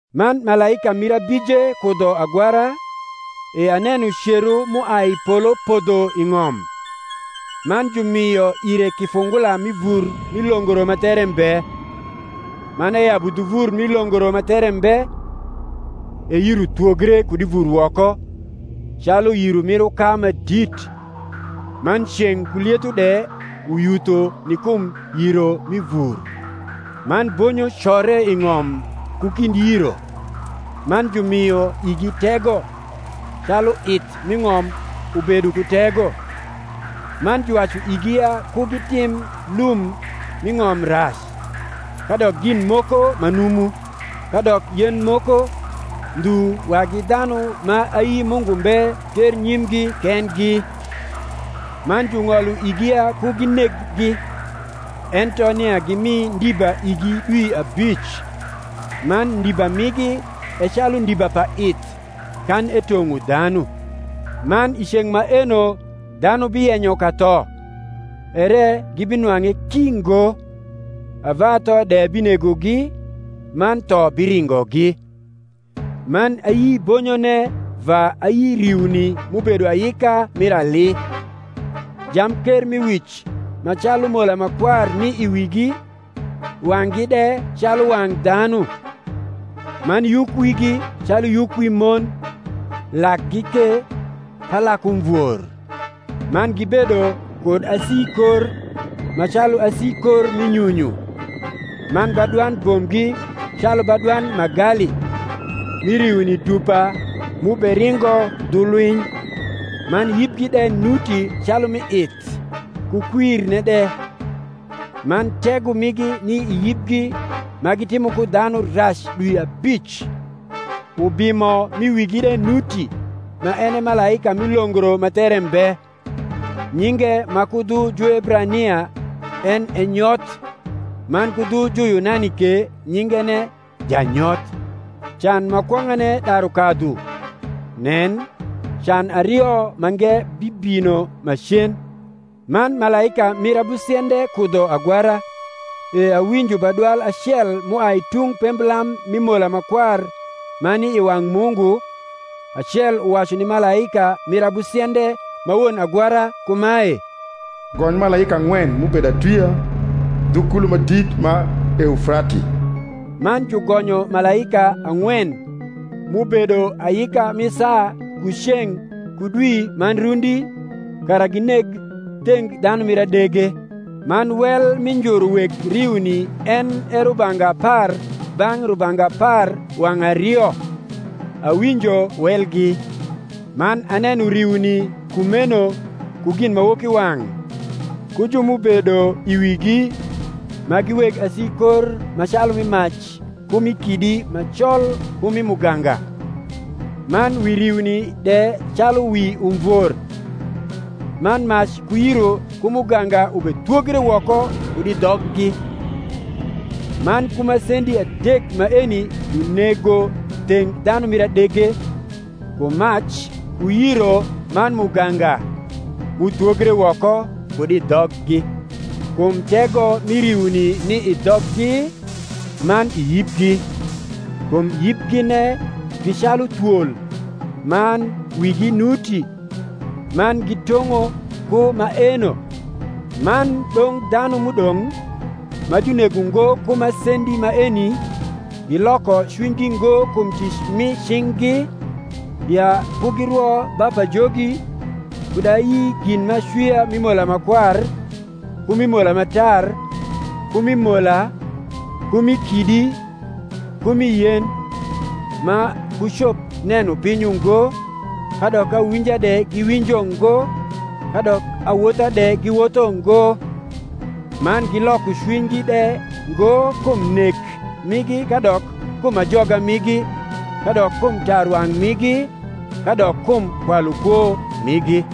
Man malaika mir abije kudho agwara, e aneno cero m’uai i polo podho i ng’om: man jumio ire kifungula mi vur mi longro ma there mbe. Man eyabu dhu vur mi longro ma there mbe; e yiro thwogre kud i vur woko, calu yiro mir uka ma dit; man ceng’ ku lietho de uyutho ni kum yiro mi vur. Man bonyo core i ng’om ku kind yiro; man jumio igi tego, calu ith m’i ng’om ubedo ku tego. Man juwacu igi ya ku gitim lum m’i ng’om rac, kadok gin moko ma numu, kadok yen moko, ndhu wagi dhanu ma ayi Mungu mbe ternyimgi kendgi. Man jung’olo igi ya ku gineggi, ento nia gimi ndiba igi dwi abic: man ndiba migi e calu ndiba pa ith, kan etong’o dhanu. Man i ceng’ maeno dhanu biyenyo katho, ere gibinwang’e ki ngo; ava tho de binegogi, man tho biringogi. Man ayi bonyone va ayi riuni m’ubedo ayika mir ali; jamkermiwic ma calu mola ma kwar ni i wigi, wang’gi de calu wang’ dhanu. Man yukwigi calu yuk wi mon, lakgi ke pa lak umvor. Man gibedo kud asikor, ma calu asikor mi nyunyu; man badwand bombgi calu badwand magali, mi riuni dupa m’uberingo dhu lwiny. Man yibgi de nuti calu mi ith, ku kwirne de; man tego migi ni i yibgi ma gitimo ko dhanu rac dwi abic. Ubimo m’i wigi de nuti ma en e malaika mi longro ma there mbe: nyinge ma ku dhu Juebrania en e Nyoth, man ku dhu Juyunani ke nyingene Janyoth. Can ma kwong’ane daru kadhu: nen, Can ario mange bibino macen. Man malaika mir abusiende kudho agwara, e awinjo badwal acel m’uai i tung pemblam mi mola ma kwar ma ni i wang’ Mungu, acel uwacu ni malaika mir abusiende ma won agwara kumae, Gony malaika ang’wen m’ubedo atwia dhu kulo ma dit ma Eufrati. Man jugonyo malaika ang’wen, m’ubedo ayika mi saa ku ceng’ ku dwi man rundi, kara gineg theng dhanu mir adege. Man wel mi njuru weg riuni en e rubanga apar bang’ rubanga apar wang’ ario: awinjo welgi. Man aneno riuni kumeno ku ginmawokiwang’, ku ju m’ubedo i wigi, ma gi weg asikor ma calu mi mac ku mi kidi ma col ku mi muganga: man wi riuni de calu wi umvor; man mac ku yiro ku muganga ubethwogre woko kud i dhoggi. Man ku masendi adek maeni junego theng dhanu mir adege, ku mac ku yiro man muganga, m’uthwogre woko kud i dhoggi. Kum tego mi riuni ni i dhoggi, man i yibgi: kum yibgine gi calu thwol, man wigi nuti; man gitong’o ku maeno. Man dong’ dhanu m’udong’, ma junego ngo ku masendi maeni, giloko cwinygi ngo kum tic mi cing’gi, ya ku girwo ba pajogi, kud ayi gin m’acwia mi mola ma kwar, ku mi mola ma tar, ku mi mola, ku mi kidi, ku mi yen: ma kucop neno piny ungo, kadok awinja de giwinjo ngo, kadok awotha de giwotho ngo: man giloko cwinygi de ngokum nek migi kadok kum ajoga migi, kadok kum tarwang’ migi, kadok kum kwalukwo migi.